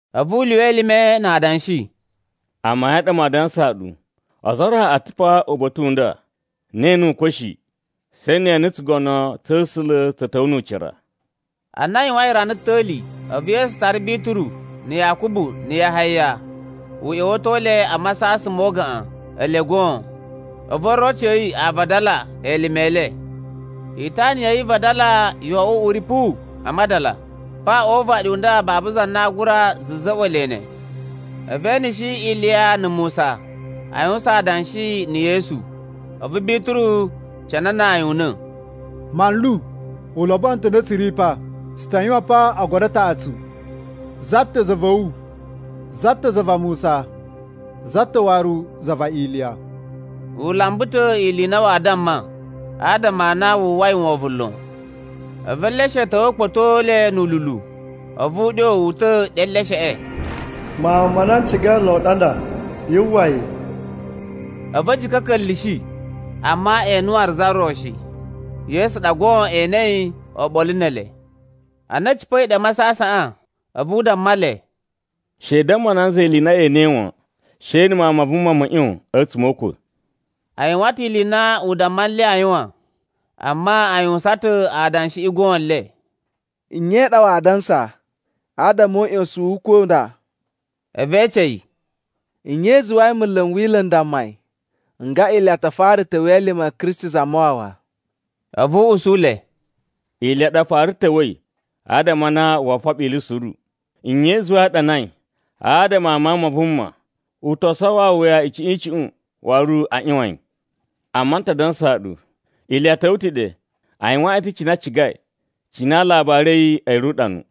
A̱vu u lyuwa elime na adanshi, “Amayun ɗa maa dansaa ɗu, ozo o ro a̱ ta̱ pa uba̱ta̱ u nda na ee ene ukwa̱ shi, she ne e ene tsugono tsa̱ A̱sula̱ tsa̱ ta̱wa̱ nu ucira.” Ana a yuwain rana ta̱li, a̱vu Yesu tara Bituru, na̱ Yakubu, na̱ Yahaya, u ꞌya̱wa̱to le a masasan mo ugaꞌan, ele goon. A̱vu oroci a̱ yi a vadala elime e le. Itana ya̱ yi i vadala yo oꞌwo uꞌuri puwu a madala, pa o uvaɗi u nda babu za na aa gura za̱za̱ꞌwa̱ le ne. A̱vu e eneshi Iliya na̱ Musa, a yuwusan adanshi na̱ Yesu. A̱vu Bituru cananaa yi una̱, “Manlu, u lobono ta̱ ana tsu ri pa. Tsu ta yuwan pa ogodo a taꞌatsu, za ta̱ za va̱ wu, za ta̱ za va Musa, za ta̱ waru za va Iliya.” U lamba ta̱ ili i na waa damma, adama a na wu uwwai wovon lon. A̱vu eleshe a̱ ta̱wa̱ a̱ kpa̱to le nu ululu, a̱vu uɗyo wu uta̱ ɗe e elesheꞌe, “Mawun ma na n cigai lon ɗa nda, yu uwwa yi.” A̱vu a̱ jika̱ a̱ ka̱nla̱shi, amma e ene waru za ro shi, Yesu ɗa goon e enei oɓolo ne ele. Ana a̱ cipa̱i ɗe a masasaꞌan, a̱vu u damma le, “She i damma nanza ili i na ye enei wan, she na̱ Mawun ma Vuma mo ꞌyon a̱tsuma̱ o ukwa̱.” A yuwan ta̱ ili i na u damma nle a yuwan, amma a yuwusan ta̱ adanshiꞌi goon le, “Nye i ɗa waa dansa adama o uꞌyosun o ukwa̱ u nda?” A̱vu e ece yi, “Nye i zuwai munlu n Wila̱ n dammai nga Iliya ta fara ta̱wa̱ elime a̱ Kristi Zamawawa?” A̱vu u usu le, “Iliya ɗa fara ta̱wa̱i, adama a na woo foɓo ili suru. Nye i zuwai a ɗanai, adama a Mawun ma Vuma, ‘U to sowo awuya icuꞌun icuꞌun, waru aa ꞌyuwan yi?’ Amma n ta dansaa ɗu, Iliya ta̱wa̱ ta̱ ɗe, a yuwaan yi ta̱ cine a cigai, cine alabari a̱ yi a̱ ri uɗanu.”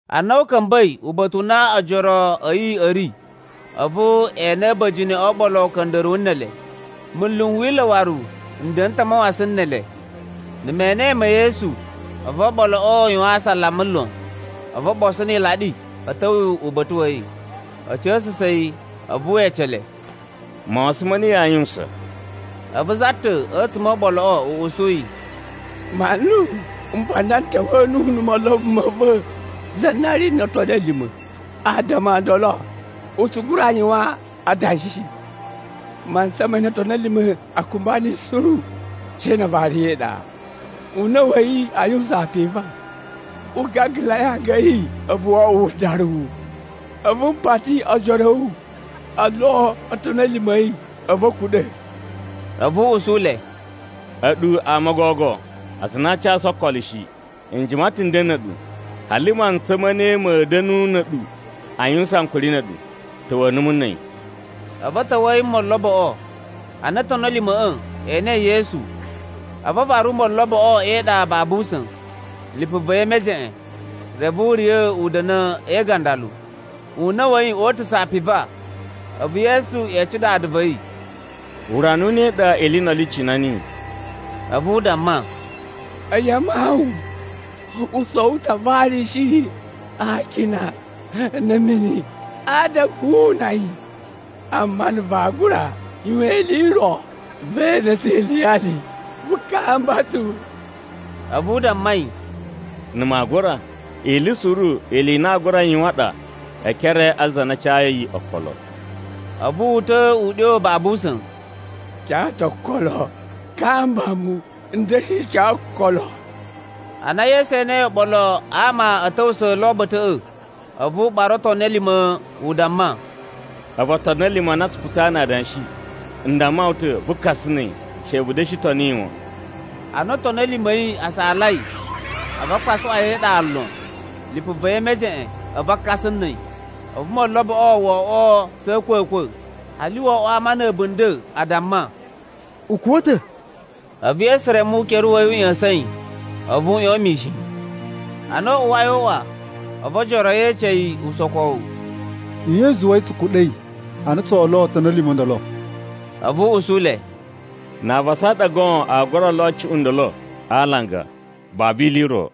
Ana a̱ ka̱mba̱i uba̱ta̱ u na ojoro a̱ yi a̱ ri, a̱vu e ene a̱ba̱jini o oɓolo uka̱nda̱ruwu ne ele. Munlu n Wila̱ waru n da̱na̱ ta̱ a mawasan ne ele. Na̱ menee ma̱ Yesu, a̱vu oɓoloꞌo a yuwan asalama lon. A̱vu o ɓoso ni ilaɗi a̱ ta̱wa̱ uba̱ta̱ wa̱ yi, a̱ ca̱sa̱sa̱ yi. A̱vu we ece le, “Mawasan ma̱ ne yaa yuwusan?” A̱vu za ta̱ a̱tsuma̱ o oɓoloꞌo u usu yi, “Manlu, mpa nda n ta̱wa̱a̱ nuwu na̱ molobo ma̱ va̱ za na ri no otoni a̱ lima̱. Adama o ndolo u tsu gura yuwan adanshi shi. Mantsa ma na otoni a̱ lima̱ꞌa̱ a kumba niyi suru, she na a vari yi e iɗa, una̱ wa̱ yi a yuwusan apiva, u gagalai anga a̱ yi, a̱vu wo oꞌwo wudaruwu. A̱vu m pati ojoro a̱ wu o lo otoni a̱ lima̱ a̱ yi, a̱vu a̱ kuɗa̱.” A̱vu u usu le, “A̱ɗu ama o gogo aza a na aa casu okolo shi. N jima ta̱ nden na̱ a̱ɗu. Hali mantsa ma̱ ne ma̱a̱ da̱nu na̱ a̱ɗu a yuwusan ankuri na̱ a̱ɗu? Ta̱wa̱a̱ numu na̱ a̱yi.” A̱vu a̱ ta̱wa̱a̱ yi na̱ moloboꞌo. Ana otoni a̱ lima̱ꞌa̱ e enei Yesu, a̱vu a varu moloboꞌo e iɗa babu usa̱n, lipu va̱ yi e mejeꞌen. Reve u riya̱ u da̱na̱ e igandalu, una̱ wa̱ yi o utusa̱ apiva. A̱vu Yesu ece dada va̱ yi, “Urana u ne ili i ndolo i cina niyi?” A̱vu u damma, “A̱yi a mawun. U sowo ta̱ a varusu yi a akina na̱ a̱ mini, adama wu una yi. Amma na̱ vaa gura yuwan ili i ro, ve ene tsu iliyali, vu kamba tsu.” A̱vu u damma yi, “Na̱ maa gura? Ili suru ili i na aa gura yuwan ɗa e ekere a za na cayi okolo.” A̱vu wu uta̱a̱ uɗyo babu usa̱n, “N ca ta̱ okolo. Kamba mu n da̱shi ca okolo.” Ana Yesu enei oɓolo a ama a̱ ta̱wusa̱ lo uba̱ta̱ꞌa̱, a̱vu u ɓara otoni a̱ lima̱, u damma, “A̱vu otoni a̱ lima̱ a na a tsu putsaa na adanshi, n damma wu ta̱, vu kasa na̱ a̱yi. She vu da̱shi toni yi wan.” Ana otoni a̱ lima̱ a̱ yi a saalai, a̱vu a kpasuꞌwa yi e iɗa lon, lipu va̱ yi e mejeꞌen, a̱vu a kasa na̱ a̱yi. A̱vu moloboꞌo wo oꞌwo tsa̱ a̱a̱kwa̱kwa̱, hali wo oꞌwo ama na̱ a̱bunda̱ a damma, “U kuwa̱ ta̱.” A̱vu Yesu reme ukere wa̱ yi u ꞌya̱sa̱n yi, a̱vu u ꞌyon mishin. Ana u uwai o uꞌwa, a̱vu ojoro a̱ yi e ece yi usokowu, “Nye i zuwai tsu kuɗa̱i, a na tsoo lo otoni a̱ lima̱ o ndolo?” A̱vu u usu le, “Na avasa a ɗa goon aa gura lo cuꞌun ndolo a alanga, babu ili i ro.”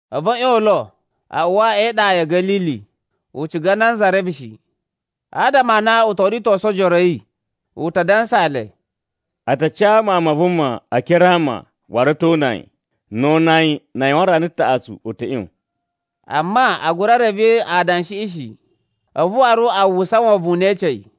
A̱vu a̱ ꞌyon lo, a uwa e iɗa ya̱ Ga̱lili. U ciga nanza reve shi. Adama a na u to ritosu ojoro a̱ yi, u ta dansaa le, “A ta ca Mawun ma Vuma e ekere a ama waru a̱ to una yi. Na̱ o una yi, na a yuwan rana taꞌatsu u ta̱ ꞌyon.” Amma a gura reve adanshiꞌi shi, a̱vu waru a uwwusa wovon na ee ece yi.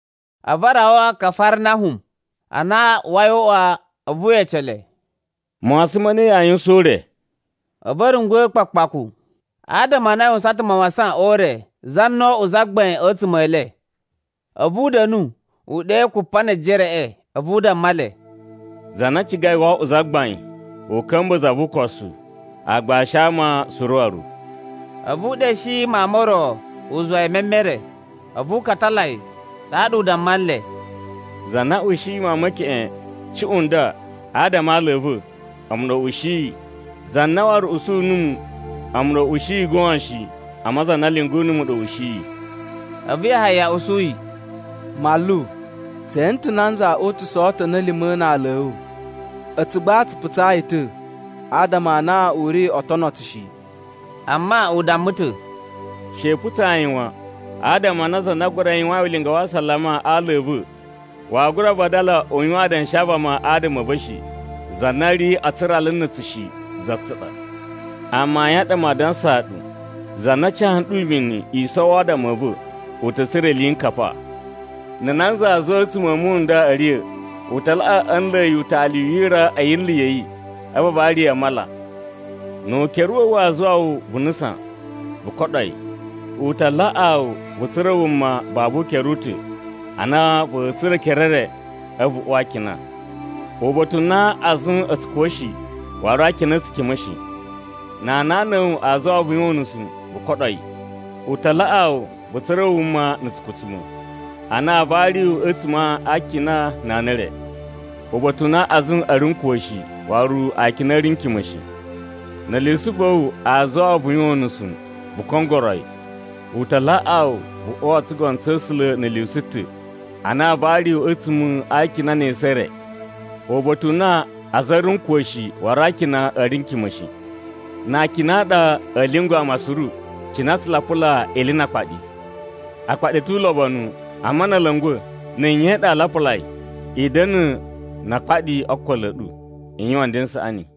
A̱vu a rawa Kafarnahum. Ana u uwai o uꞌwa, a̱vu we ece le, “Mawasan ma̱ ne yaa yuwusan o ure?” A̱vu a̱ rungwa̱ kpaku kpaku, adama a na a yuwan ta̱ mawasan o ure za na oꞌwo zagbain a̱tsuma̱ e le. A̱vu u da̱nu, u ɗe Kupanejereꞌe. A̱vu u damma le, “Za na cigai woo oꞌwo zagbain, u ka̱mba̱ za vu ukosu, aagbashi a ama suru waru.” A̱vu u sheɗe mawun mo ro u zuwa yi e memere, a̱vu u katala yi. Ɗaɗa u damma nle, “Za na ushiyi mawun me keꞌen cuꞌun nda adama a ala a̱ va̱, a̱mu ɗa u ushiyi. Za na waru usu numu, a̱mu ɗa u ushiyi goon shi, amma za na lyungu numu ɗa u ushiyi.” A̱vu Yahaya usu yi, “Manlu, tse ene ta̱ nanza o utusa̱a̱ otoni a̱ lima̱ na ala a̱ wu. A̱tsu gba tsu putsa yi ta̱, adama a na u ri oo tono tsu shi.” Amma u damma ta̱, “She i putsa yi wan, adama a na za na gura yuwain ulinga wa asalama a ala a̱ va̱, waa gura vadala u yuwan adanshi avama adama a̱ va̱ shi. Za na ri a tsurala na̱ tsu shi, za tsu ɗa. Amayun a ɗa maa dansaa ɗu, za na ca nɗu mini i sowo adama a̱ va̱, u ta̱ tsura̱ iliyinkapa. “Na̱ nanza aa zuwa a̱tsuma̱ a̱ muwun n nda a̱ riya̱, u ta laꞌa a̱ nla̱a̱ yi utali u yira a̱ yinlu ya̱ yi, a̱vu a vari yi a mala. Nu ukere wa̱ wu waa zuwa wu, vu nusan, vu koɗo yi. U ta laꞌaa wu, vu tsura̱ wuma babu ukere u ta̱ ana va̱a̱ tsura̱ ekere e re, a̱vu vu uwa a akina. [Uba̱ta̱ u na azun a̱ tsu kuwa̱ shi, waru akina a̱ tsu kima̱ shi.] Na anana a̱ wu aa zuwa wu vu yuwan unusu, vu koɗo yi. U ta laꞌaa wu, vu tsura̱ wuma na̱ tsukutsuma̱, ana aa vari wu a̱tsuma̱ a akina na ana e re. [Uba̱ta̱ u na azun a̱ ri n kuwa̱ shi, waru akina a̱ ri n kima̱ shi.] Na̱ lyusu va̱ wu aa zuwa wu vu yuwan unusu, vu kongoro yi. U ta laꞌaa wu, vu uwa o tsugono tsa̱ A̱sula̱ na̱ lyusu ta̱, ana aa vari wu a̱tsuma̱ a akina ne esu e re. Uba̱ta̱ u na azun a̱ ri n kuwa̱ shi, waru akina a̱ ri n kima̱ shi. “Na akina a ɗa aa lyungwa̱ ama suru, cine a tsu lapula ili na akpaɗi. “Akpaɗi a̱ tu ulobonu, amma na̱ a̱ la̱nga̱, na̱ nye ɗa vaa lapula yi? “I da̱na̱ na akpaɗi o okolo a̱ ɗu, i yuwan nden n saꞌani.”